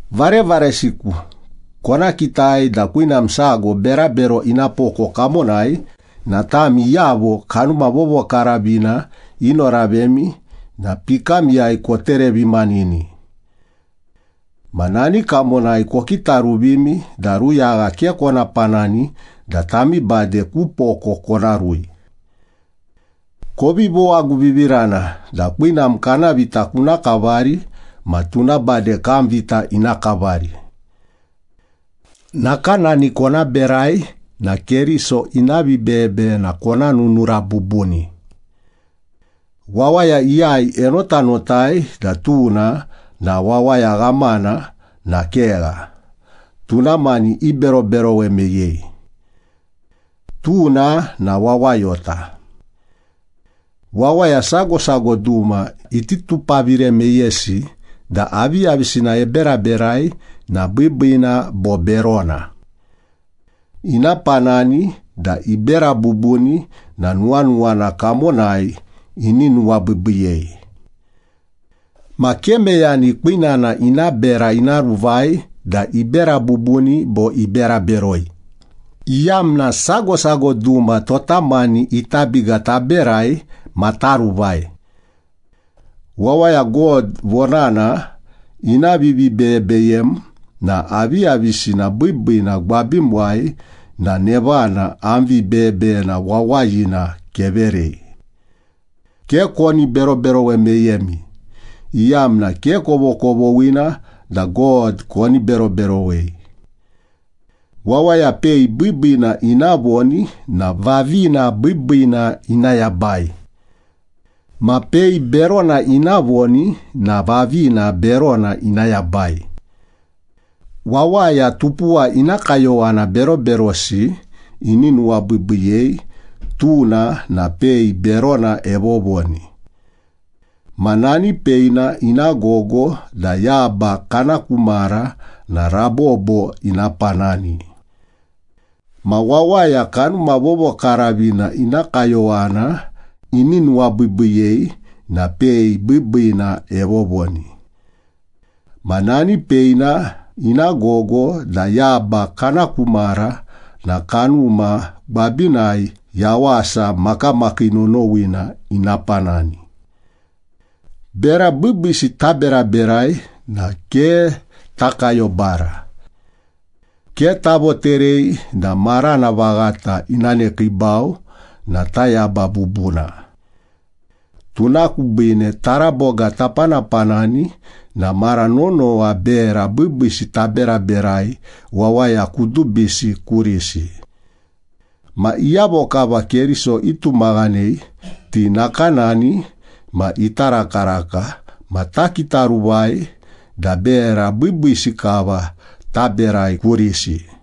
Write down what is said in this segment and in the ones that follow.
Varevaresiku, kona kitai da kwinam sago berabero ina poko kamonai na tami iyavo Kanuma Vovokaravina inoravemi na pikamiyai koterevimanini. Ma nani kamonai kokitaruvimi da ruyagha ke kona panani da tami bade ku poko kona rui. Kovi vowaguvivirana da kwinam kana vita kuna kavari ma tuna bade kam vita ina kavari. Nakanani kona berai na Keriso ina vibeyebeyena kona nunura bubuni. Wawaya iyai enotanotai da tuna na wawaya ghamana na kegha, tuna mani iberoberowe meyei. Tuna na wawayota. Wawaya sago sago duma iti tupavire meyesi da aviyavisina eberaberai na biibiina bo berona. Ina panani da ibera bubuni na nuwanuwana kamonai ini nuwabiibiiyei. Ma ke meyani kwinana ina bera ina ruvai da ibera bubuni bo ibera beroi, iyamna sago sago duma tota mani ita biga taberai ma taruvai. Wawaya God vonana ina vivibeyebeyem na aviyavisina biibiina gwabimuwai na nevana am vibeyebeyena wawayina keverei. Ke koni beroberowe meyemi, iyamna ke kovokovoghina da God koni beroberowei. Wawaya pei biibiina ina voni na vavina biibiina ina yabai. Ma pei berona ina voni na vavina berona ina yabai. Wawaya tupuwa ina kayowana beroberosi ini nuwabiibiiyei, tuna na pei berona evovoni. Ma nani peina ina gogo da yaba kana ku mara na rabobo ina panani. Ma wawaya Kanuma Vovokaravina ina kayowana ini nuwabiibiiyei na pei biibiina evovoni. Ma nani peina ina gogo da yaba kana ku mara na Kanuma gwabinai yawasa makamakii nonowina ina panani. Bera biibiisi taberaberai na ke takayobara. Ke tavoterei da marana vaghata ina nekiibau na tayaba bubuna. Tuna kubiine, taraboga tapanapanani na mara nonowa bera biibiisi taberaberai wawaya kudubisi kurisi. Ma iyavo kava Keriso itumaghanei, ti nakanani ma ita rakaraka, ma takitaruvai da bera biibiisi kava taberai kurisi.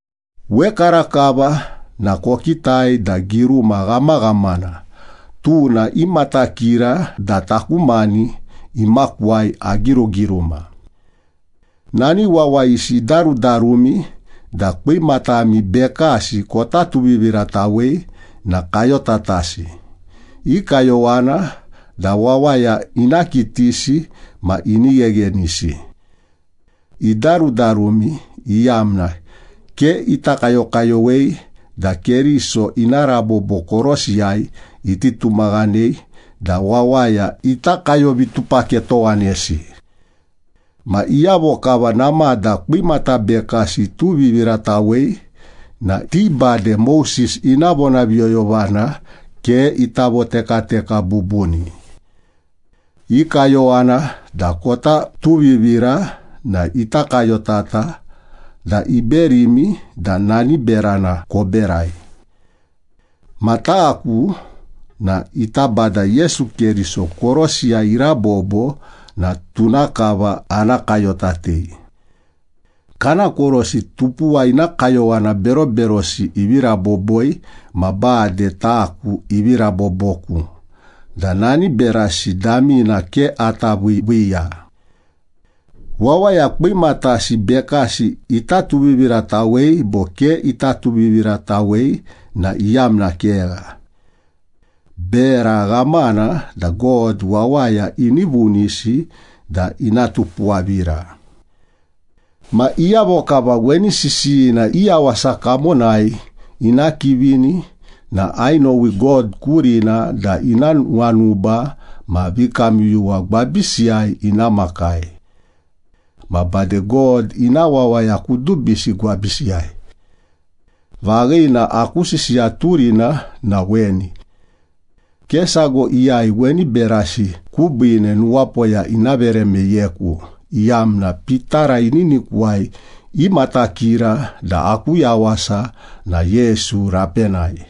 Wekarakava na kokitai da giruma ghamaghamana, tuna imatakira da taku mani imakuwai agirugiruma. Nani wawayisi idarudarumi da kwimatami bekasi kota tuviviratawei na kayotatasi, i kayowana da wawaya ina kitisi ma ini gheghenisi. Idarudarumi, iyamna ke ita kayokayowei da Keriso ina rabobo korosiyai iti tumaghanei da wawaya ita kayovitupaketowanesi. Ma iyavo kava namada kwimata bekasi ituviviratawei na ti bade Moses ina vonaviyoyovana ke ita votekateka bubuni. I kayowana da kota tuvivira na ita kayotata da iberimi da nani berana koberai. Ma taku na ita Bada Yesu Keriso korosiyai irabobo na tuna kava ana kayotatei. Kana korosi tupuwa ina kayowana beroberosi ivi raboboi, ma bade taku ivi raboboku da nani berasi damina ke ata viiviiya. Wawaya kwimatasi bekasi ita tuviviratawei bo ke ita tuviviratawei na iyamna kegha. Bera ghamana da God wawaya ini vunisi da ina tupuwavira. Ma iyavo kava weni sisiyina i yawasa kamonai ina kivini na ainowi God kurina da ina nuwanuba ma vikamyuyuwa gwabisiyai ina makai. Ma bade God ina wawaya kudubisi gwabisiyai. Vaghina aku sisiya turina na weni. Ke sago iyai weni berasi kubiine nuwapoya ina vere meyeku, iyamna pitara ininikuwai imatakira da aku yawasa na Yesu rapenai.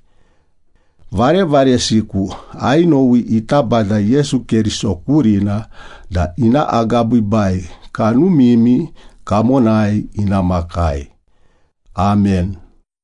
Varevaresiku, ainowi ita Bada Yesu Keriso kurina da ina agabiibai kanumimi kamonai ina makai. Amen.